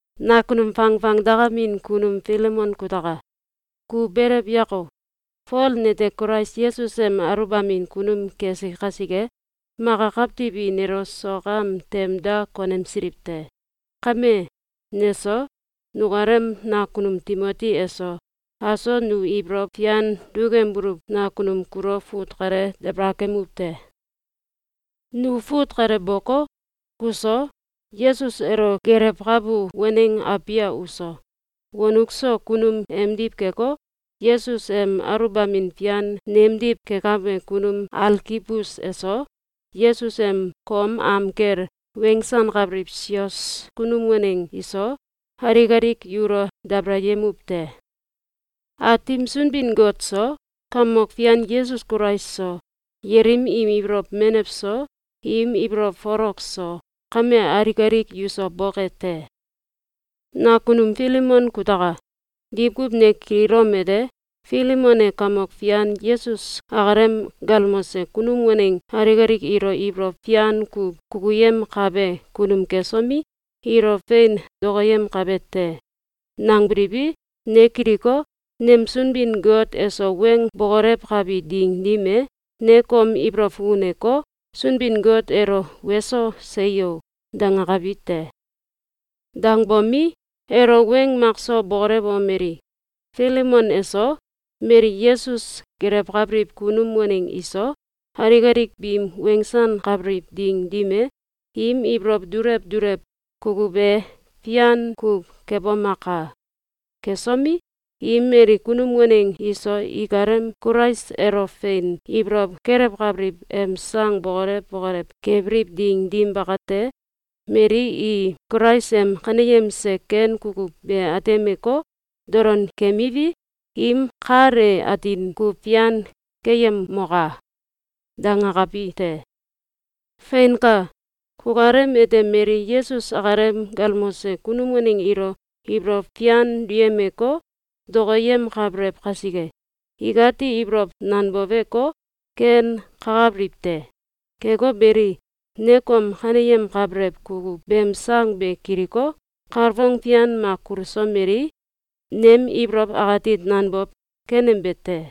Nakunum fangfangdakamin kunum Filemon kutaka! Ku belew yako! Fol nete Kulais Yesus em aluwbamin kunum kesi kasike, maka kawtiw i nelo sok am tem da konemsiliw te. Kame, neso, nukalem nakunum Timoti eso, aso nu ibolow fian dukembuluw nakunum kulo fut kale dabalakemuw te. Nu fut kale boko, kuso, Yesus elo gelewkabu waneng Abia uso, wonuk so kunum emdiw keko, Yesus em aluwbamin fian nemdiw kekabe kunum Alkibus eso, Yesus em kom am kel wensankabiliw sios kunum waneng iso, alik alik yulo dabalayemuw te. Aatim Sunbin-Got so, Kamok Fian Yesus Kulais so, yelim im ibolow menew so, im ibolow folok so, kame alik alik yuso boke te! Nakunum Filemon kutaka! Diwkuw ne kililom ete: “Filemon e Kamok Fian Yesus akalem galmose kunum waneng alik alik ilo ibolow fian kuw kukuyemkabe kunum kesomi, ilo fein dokoyemkabe te!”, nangbiliwi, ne kiliko, nem Sunbin-Got eso weng bokolewkabi ding dim e, ne kom ibolow fukuneko, Sunbin-Got elo “Weso! Seyo!”, dangakabi te. Dangbomi, elo weng makso bokolewomeli: “Filemon eso, mali Yesus gelewkabiliw kunum waneng iso, alik alik biim wensankabiliw ding dim e, im ibolow dulew dulew kukuw be fian kuw kebomaka! Kesomi, im mali kunum waneng iso ikalem Kulais elo fein ibolow kelewkabiliw em sang bokolew bokolew kebiliw ding dim bakate, mali i Kulais em kaneyemse ken kukuw be atemeko, dolon keemiwi, im kal e atin kuw fian keyemoka!”, dangakabi te. Feinka! Kukalem ete mali Yesus akalem galmose kunum waneng ilo ibolow fian duyemeko, dokoyemkabelew kasike, ikati ibolow nanboweko, ken kakabiliw te. Keko beli, ne kom kaneyemkabelew kukuw beem sang be kiliko, kalfong fian mak kulusomelii, nem ibolow akati nanbow kenembe te.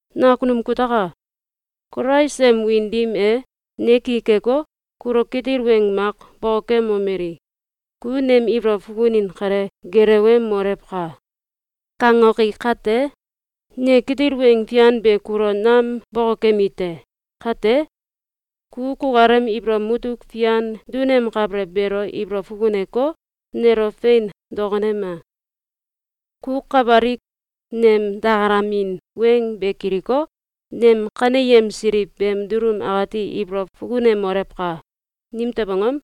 Nakunum kutaka! Kulais em wiin dim e, ne ki keko, kulo kitil weng mak bokokemomeli: “Ku nem ibolow fukunin kale gelewemolewka!”, kangoki kate, ne kitil weng fian be kulo nam bokokemi te. Kate, ku kukalem ibolow mutuk fian dunemkabelew beelo ibolow fukuneko, nelo fein dokonema! Ku kawalik nem dakalamin weng be kiliko, nem kaneyemsiliw beem dulum akati ibolow fukunemolewka! Nimtew angom?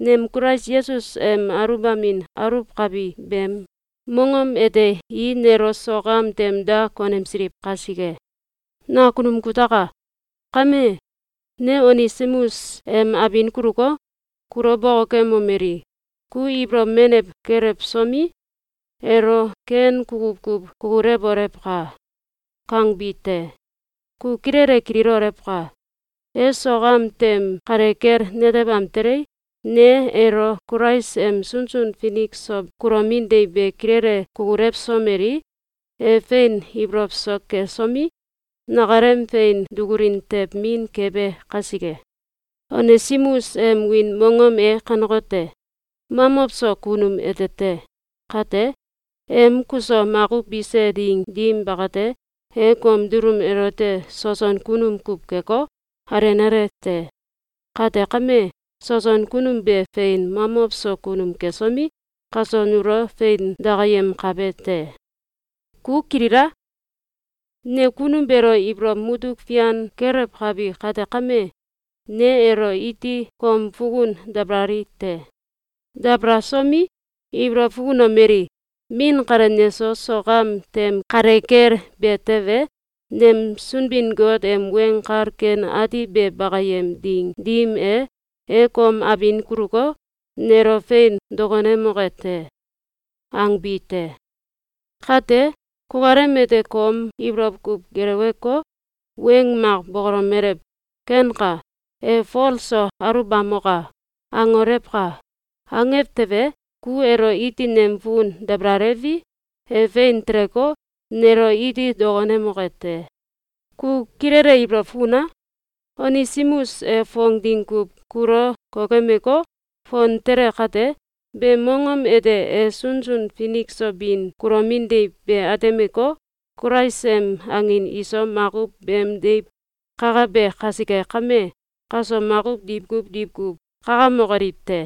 Nem Kulais Yesus em aluwbamin aluwkabi beem mongom ete i nelo sok am tem da konemsiliw kasike. Nakunum kutaka! Kame, ne Onesimus em abin kuluko, kulo bokokemomeli: “Ku ibolow menew kelewsomi, elo ken kukuw kuw kukulewolewka!”, kangbi te. Ku kilele kililolewka! E sok am tem kale kel netebam telei, ne elo Kulais em sunsun finik so kulomin deiw be kilele kukulewsomelii, e fein ibolow so kesomi, nakalem fein dukulin tew min kebe kasike. Onesimus em wiin mongom e kanekote: “Mamow so Kunum” ete te. Kate, em kuso makuw bise ding dim bakate, e kom dulum elote soson kunum kuw keko, alenale te. Kate kame, soson kunum be fein mamow so kunum kesomi, kaso nulo fein dakayemkabe te. Ku kilila! Ne kunum beelo ibolow mutuk fian kelewkabi kate kame, ne elo iti kom fukun dabalali te. Dabalasomi, ibolow fukunomeli: “Min kale neso sok am tem kale kel be tewe, nem Sunbin-Got em Weng Kal Ken Ati be bakayem ding dim e, e kom abin kuluko, nelo fein dokonemoke te!”, angbi te. Kate, kukalem ete kom ibolow kuw geleweko, weng mak bokolomelew: “Kenka! E Fol so aluwbamoka!”, angolewka! Angew tewe, ku elo iti nem fukun dabalalewi, e fein teleko, nelo iti dokonemoke te. Ku kilele ibolow fukuna! Onesimus e fong ding kuw kulo kokemeko, fon tele kate, beem mongom ete e sunsun finik so bin kulomin deiw be atemeko, Kulais em angin iso makuw beem deiw kakabe kasike kame, kaso makuw diwkuw diwkuw kakamokoliw te.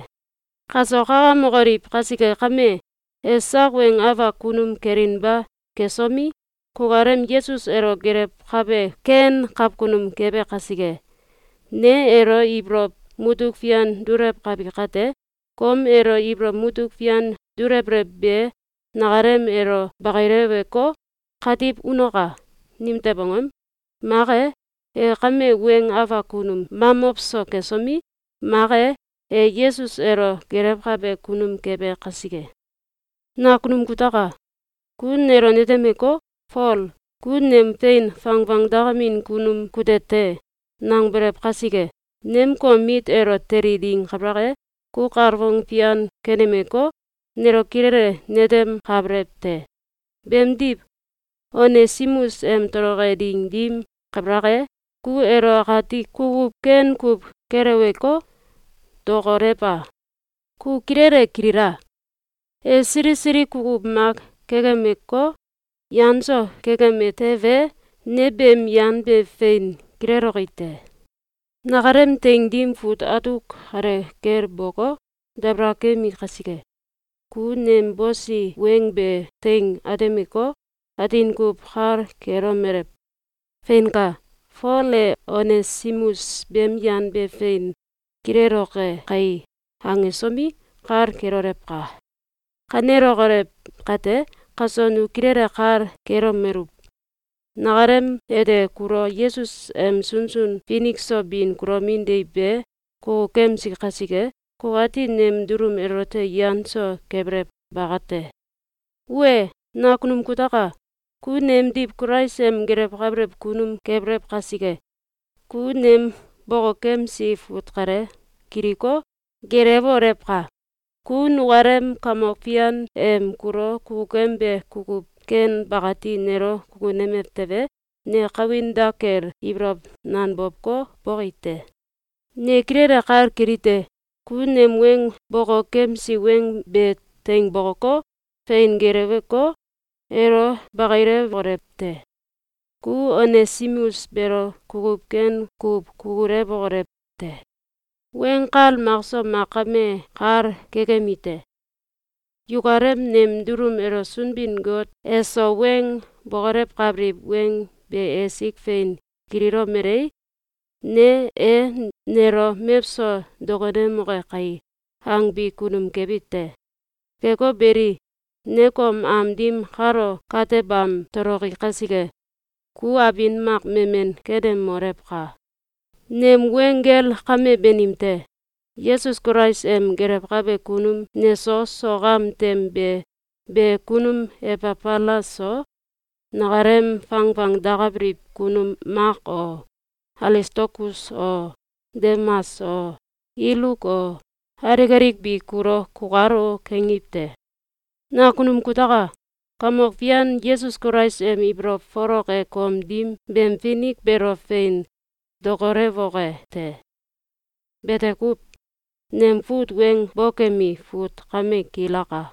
Kaso kakamokoliw kasike kame, e sak weng afak kunum kelinba kesomi, kukalem Yesus elo gelewkabe ken kawkunum kebe kasike. Ne elo ibolow mutuk fian dulewkabi kate, kom elo ibolow mutuk fian dulewbelew be nakalem elo bakileweko, katiw unoka! Nimtew angom? Mak e, e kame weng afak kunum mamow so kesomi, mak e, e Yesus elo gelewkabe kunum kebe kasike. Nakunum kutaka! Ku nelo netemeko, “Fol, ku nem fein fangfangdakamin kunum kute te!”, nangbelew kasike, nem kom mit elo teli ding kabalak e, ku kalfong fian kenemeko, nelo kilele netemkabelew te. Beemdiw, Onesimus em toloke ding dim kabalak e, ku elo akati kukuw ken kuw keleweko, dokolewa! Ku kilele kilila! E sili sili kukuw mak kekemeko, yan so kekeme tewe, ne beem yan be fein kileloki te. Nakalem teing dim fut atuk kale kel boko, dabalakemi kasike, ku nem bosi weng be teing atemeko, atin kuw kal kelomelew: “Feinka! Fol e Onesimus beem yan be fein kileloke kai!”, angesomi, kal kelolewka! Kanelokolew kate, kaso nu kilele kal kelomeluw: Nakalem ete kulo Yesus em sunsun finik so bin kulomin deiw be kukukemsi kasike, kukati nem dulum elote yan so kebelew bakate. Wee, nakunum kutaka! Ku nemdiw Kulais em gelewkabelew kunum kebelew kasike, ku nem bokokemsi fut kale kiliko, gelewolewka! Ku nukalem Kamok Fian em kulo kukukembe kukuw ken bakati nelo kukunemew tewe, ne kawin dak kel ibolow nanbowko, boki te. Ne kilele kal kelite: Ku nem weng bokokemsi weng be teing bokoko, fein geleweko, elo bakilewolew te. Ku Onesimus beelo kukuw ken kuw kukulewokolew te. Weng kal makso mak kame kal kekemi te. Yukalem nem dulum elo Sunbin-Got eso weng bokolewkabiliw weng be esik fein kililomelei, ne “E nelo mewso dokonemoke kai!”, angbi kunum kebi te. Keko beli, ne kom am dim kalo katebam toloki kasike, ku abin mak memen kenemolewka! Nem weng gel kame banim te. Yesus Kulais em gelewkabe kunum neso sok am tem be be kunum Ebafalas so, nakalem fangfangdakabiliw kunum Mak o, Alistalkus o, Demas o, Iluk o, alik alik bi kulo “Kukalo!”, kangiw te. Nakunum kutaka! Kamok Fian Yesus Kulais em ibolow folok e kom dim beem finik beelo fein dokolewoke te. Bete kuw. Nem fut weng bokemi fut kame kilaka.